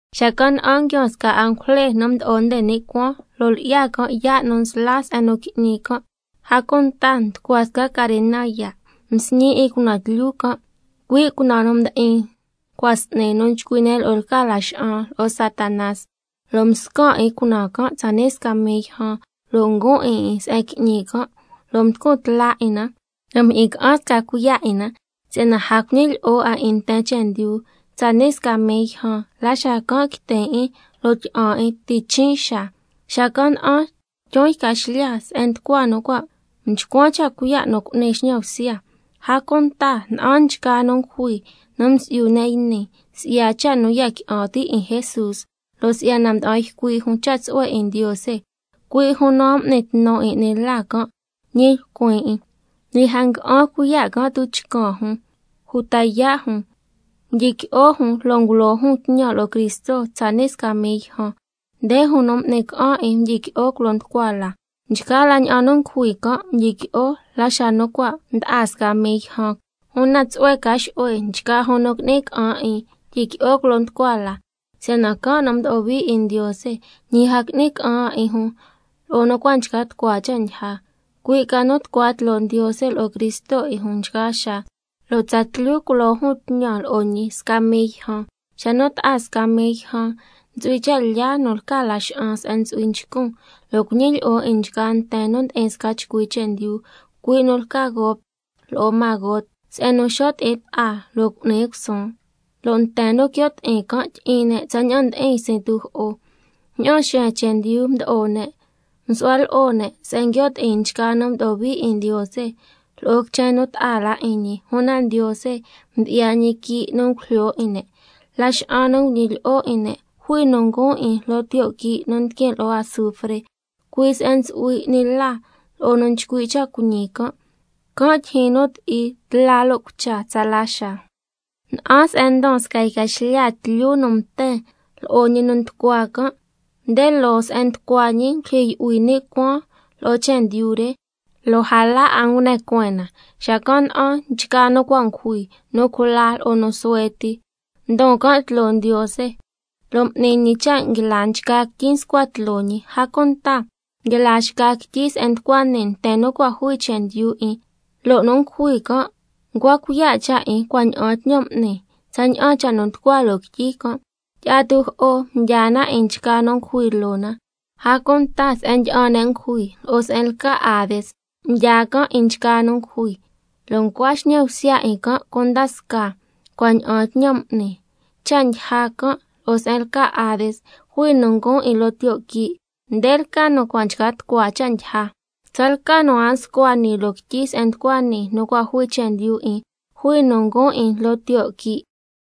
Xacan' na'an nguiaan sca angujle nu mdo'o nde ni' cuaan, lo' lyi'ya can' yaa' nu nsla se'en nu qui'ñi can', a cunta nducua sca carena yaa'. Msñi 'in cunaan tlyu can', cui' cunaan nu ndi'in cua' s'ni nu nchcui' ne' lo'o lca laxa'an lo'o Satanás, lo' mscan' 'in cunaan can' tsani' sca mii yjan, lo' nguun 'in 'in se'en qui'ñi can', lo' mducun tla 'in na lo' mjyi'in ca'an sca cuiya' 'in na, si'yana a cuñilyi'o 'a 'in nten chendyu tsani' sca mii yjan, la xacan' quitin' 'in lo' tyi'an 'in ti' chin' xaa. Xacan' na'an tyun yca xlya se'en nducua nu cua' mchcuan cha' cuiya' nu cu'ni xñan bsya, a cunta na'an nchgaa nu ngujui nu msi'yu ne' yni, si'ya cha' nu ya qui'an ti' 'in Jesús, lo' si'yana mda'an ycui' jun cha' tsu'hue 'in Ndiose, cui' jun nu a m'ni tnu 'in 'ni la can', ñi lcuin 'in, ñi a ngua'an cuiya' can' tuchcan jun uta yaa' jun. Mdyiqui'o jun lo' ngulo jun tñan lo'o Cristo tsani' sca mii yjan. Nde jun nu m'ni ca'an 'in mdyiqui'o culo nducua la. Nchgaa la ña'an nu ngujui can' mdyiqui'o la xa nu cua' mda'a sca mii yjan. Una tsu'hue ca xu'hue nchgaa jun nu qui'ni ca'an 'in tyiqui'o culo nducua la, si'yana can' nu mdo'o hui 'in Ndiose, ñi a qui'ni ca'an 'a 'in jun lo'o nu cua' nchca tucua cha' ndyija, cui' ca nu tucua tloo Ndiose lo'o Cristo 'in jun nchgaa xaa, lo' tsatlyu culo jun tñan lo'o ñi sca mii yjan. Xa nu ta'a sca mii yjan, ntsu'hui cha' lyaa nu lca Laxa'an se'en ntsu'hui nchcun, lo' cuñilyi'o 'in nchgaa nten nu ndi'in sca chcui chendyu, cui' nu lca Gog lo'o Magog, se'en nu xo' ti'in ta'a lo' cu'ni cusuun, lo' nten nu quio' ti'in can' tyi'in ne' tsaña'an ndi'in ysin tujo'o. Ña'aan xeen chendyu mdo'o ne', msu'hua lo'o ne' se'en nguio' ti'in nchgaa nu mdo'o hui 'in Ndiose lo'o quichen nu ta'a la 'in ñi, una Ndiose mdyi'ya ñi quii' nu ngujlyo 'in ne'. Laxa'an nu nguñilyi'o 'in ne', jui nu nguun 'in loo tiyo' quii' nu ndiquin lo'o azufre, cui' se'en ntsu'hui 'ni la lo'o yu nu nchcui' cha' cuiñi can', can' tyijyin nu ti'i tla lo' cucha tsala xaa. Na'an se'en ndon sca yca xlya tlyu nu mten, lo'o ñi nu nducua can', nde loo se'en nducua ñi ngulyijyi yu'hui ni' cuaan lo'o chendyu re, lo' a la 'a ngune cueen na. Xacan' na'an nchgaa nu cua' ngujui, nu cula lo'o nu suhue ti, ndon can' tloo Ndiose, lo' m'ni ñi cha' nguila nchgaa quityi nscua tloo ñi, a cunta nguila xca quityi se'en nducua nii nten nu cua' jui chendyu 'in. Lo' nu ngujui can' ncua cuiya' cha' 'in cua' ña'aan tñan m'ni tsaña'an cha' nu nducua loo quityi can'. Tyi'a tujo'o mdyaa na 'in nchgaa nu ngujui loo na, a cunta se'en ndyi'an ne' ngujui, lo'o se'en lca Hades mdyaa can' 'in nchgaa nu ngujui, lo' ncua xñan bsya 'in can' cunda scaa cua' ña'aan tñan m'ni. Cha' ndyija can' lo'o se'en lca Hades jui nu nguun 'in loo tiyo' quii'. Nde lca nu cua' nchca tucua cha' ndyija. Tsalca nu a nscua nii loo quityi se'en nducua nii nu cua' jui chendyu 'in, jui nu nguun 'in loo tiyo' quii'.